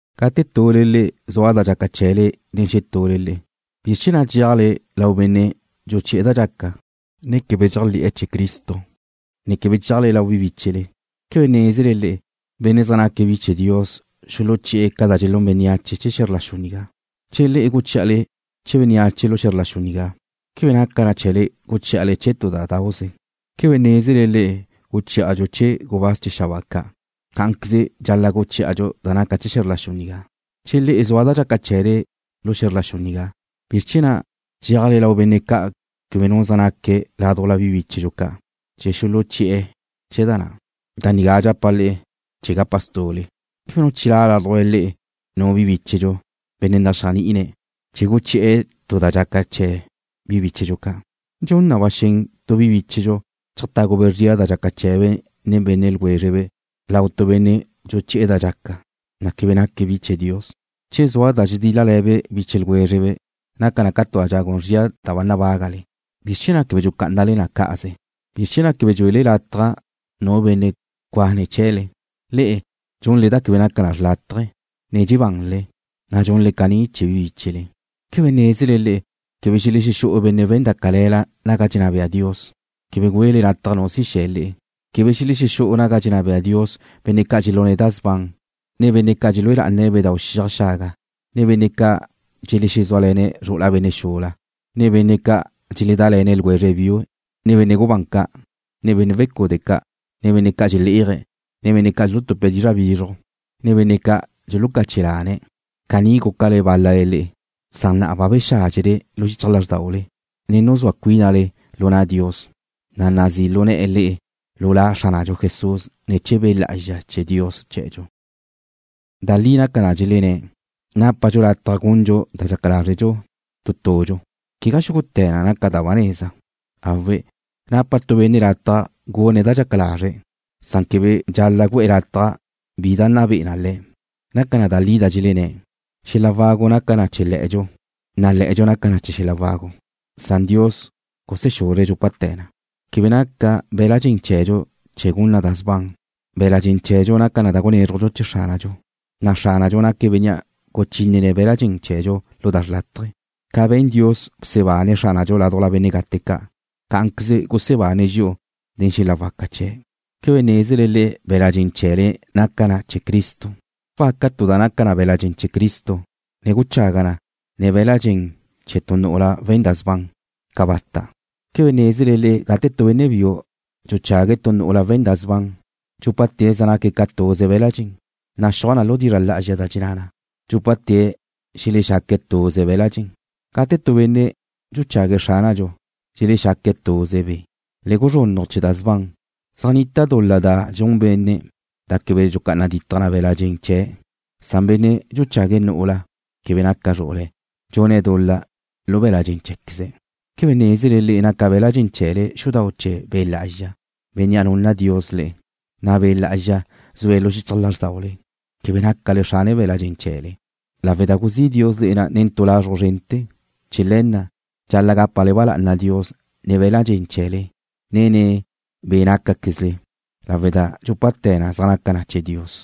Gate tule le'e zua da dxaca chee̱le nen xetule le'e, ¿bizr chee̱ na' dxeajle lau benne' dxuchi'e̱ da dxaca, na' quebe dxéajle̱'e̱ chee̱ Cristo, ne quebe dxeajle lau bi bíchele? ¿Quebe nézele le'e, benne' zaj naca bi chee̱ Dios xuluchí'e̱ ca da dxelún bénneache chee̱ xe̱zr la xu nigá? Che le'e guchí'ale chee̱ bénneache lu xe̱zr la xu nigá, ¿quebe naca chee̱le guchí'ale chee̱ tu da dauze? ¿Quebe nézele le'e guchí'adxu chee̱ gubáz chee̱ xabáa ca'? Cá'anqueze dxal-la' guchí'adxu da naca chee̱ xe̱zr la xu nigá. Che le'e zua da dxaca chee̱le lu xe̱zr la xu nigá, ¿bizr chee̱ na' dxeajle lau benne' ca' quebe nu zaj naque̱' ládujla bi bíchedxu ca' chee̱ xuluchí'e̱ chee̱ da na'? Da nigá dxapa' le'e chee̱ gapa stu'le. ¿Quebe nu chilá' ládujla le'e nu bíchedxu, benne' naxéajni'ine̱' chee̱ guchi'e̱ tu da dxaca chee̱ bi bíchedxu ca'? ¿Dxun na ba xen tu bi bíchedxu cheajtágube' zria da dxaca chee̱be' nen benne' ljwézrebe' lau tu benne' dxuchi'e̱ da dxaca, na' quebe naque̱' bi chee̱ Dios? Che zua da dxedíl-lale̱le biche ljwézrele, naca na tu zria da ba nabágale. ¿Bizr chee̱ na' quebe dxucá'anale na cá'aze? ¿Bizr chee̱ na' quebe dxuele lataj nu benne' cuane̱' chee̱le? Le'e dxunle da quebe naca na xrlátaje, ne dxebanle, na' dxunle caní chee̱ bi bíchele. ¿Quebe nézele le'e, quebe xelexú'u benne' we̱n da cale̱la naga dxenná bea Dios? Quebe güele lataj nu si xe̱ le'e. Quebe xelexú'u naga dxenná bea Dios benne' ca' dxelune̱' da sban, ne benne' ca' dxelúe lá'ane̱' bedáu' xiaj xaga, ne benne' ca' dxelezúale̱ne̱' zru'ula benne' xula, ne benne' ca' dxeledále̱ne̱' ljwezre biue̱', ne benne' gubán ca', ne benne' wecude' ca', ne benne' ca' dxelé'aje̱', ne benne' ca' dxulutupe̱' dizra' bizruj, ne benne' ca' dxulucache lane̱'. Caní gúcale bál-lale le'e, san na'a bache bexádxele lu xichaj lázrdaule, ne nuzúa cuínale lu na' Dios, na' nazí' lu ne̱'e̱ le'e lu La Xránadxu Jesús ne̱ chee̱ Be' Lá'azxa chee̱ Dios chee̱dxu. Da li naca da dxelenné̱': Nápadxu lataj gundxu da dxaca lazre' tu tudxu. Quegá xúgute̱ na naca na da ba neza. Awe', napa tu benne' lataj gune̱' da dxaca lazre̱', san quebe dxal-la' gu'e̱ lataj bi da nna be'e na le̱'. Naca da li da dxelenné̱': Xela wagu naca na chee̱ le̱'e̱dxu, na' le̱'e̱dxu naca na chee̱ xel-la wagu, san Dios gusexuzre̱' dxúpate̱ na. Quebe naca be̱la' dxen chee̱dxu chee̱ gun na da sban. Be̱la' dxen chee̱dxu naca na da gunézrujdxu chee̱ Xránadxu, na' Xránadxu naque̱' Bénnea' guchínene̱' be̱la' dxen chee̱dxu lu da xrlátaje. Ca be̱n Dios bsebane̱' Xránadxu ládujla benne' gate ca', cá'anqueze gusebane̱' dxi'u nen xel-la waca chee̱'. ¿Quebe nézele le'e be̱la' dxen chee̱le naca na chee̱ Cristo? ¿Wacá'a tu da naca na be̱la' dxen chee̱ Cristo, ne guchaga' na nen be̱la' dxen chee̱ tu nu'ula we̱n da sban? ¡Cabata'! ¿Quebe nézele le'e gate tu benne' biu dxuchague̱' tu nu'ula we̱n da sban dxúpate̱' zaj naque̱' ca tuze be̱la' dxen? Naxúaj lu dizra' lá'azxa da dxenná na: Dxúpate̱' xelexaque̱' tuze be̱la' dxen. Gate tu benne' dxuchague̱' Xránadxu, dxelexaque̱' tuze be'. Le guzrunnaj chee̱ da sban. Zaj nita dul-la xula da dxun benne' da quebe dxulucá'ana ditaj na be̱la' dxen chee̱', san benne' dxuchague̱' nu'ula quebe naca zru'ule̱' dxune̱' dul-la lu be̱la' dxen chee̱queze̱'. ¿Quebe nézele le'e naca be̱la' dxen chee̱le xudau' chee̱ Be' Lá'azxa, Bénnea' nunna Dios le'e, na' Be' Lá'azxa zue̱' xichaj lázrdaule? Quebe nácale xrana be̱la' dxen chee̱le, lawe' da guzí' Dios le̱ na nen tu lazruj zrente̱. Chee̱ le̱ na', dxal-la' gápale ba lá'ana Dios nen be̱la' dxen chee̱le, ne nen be' nácaquezle, lawe' da dxúpate̱ na' zaj naca na chee̱ Dios.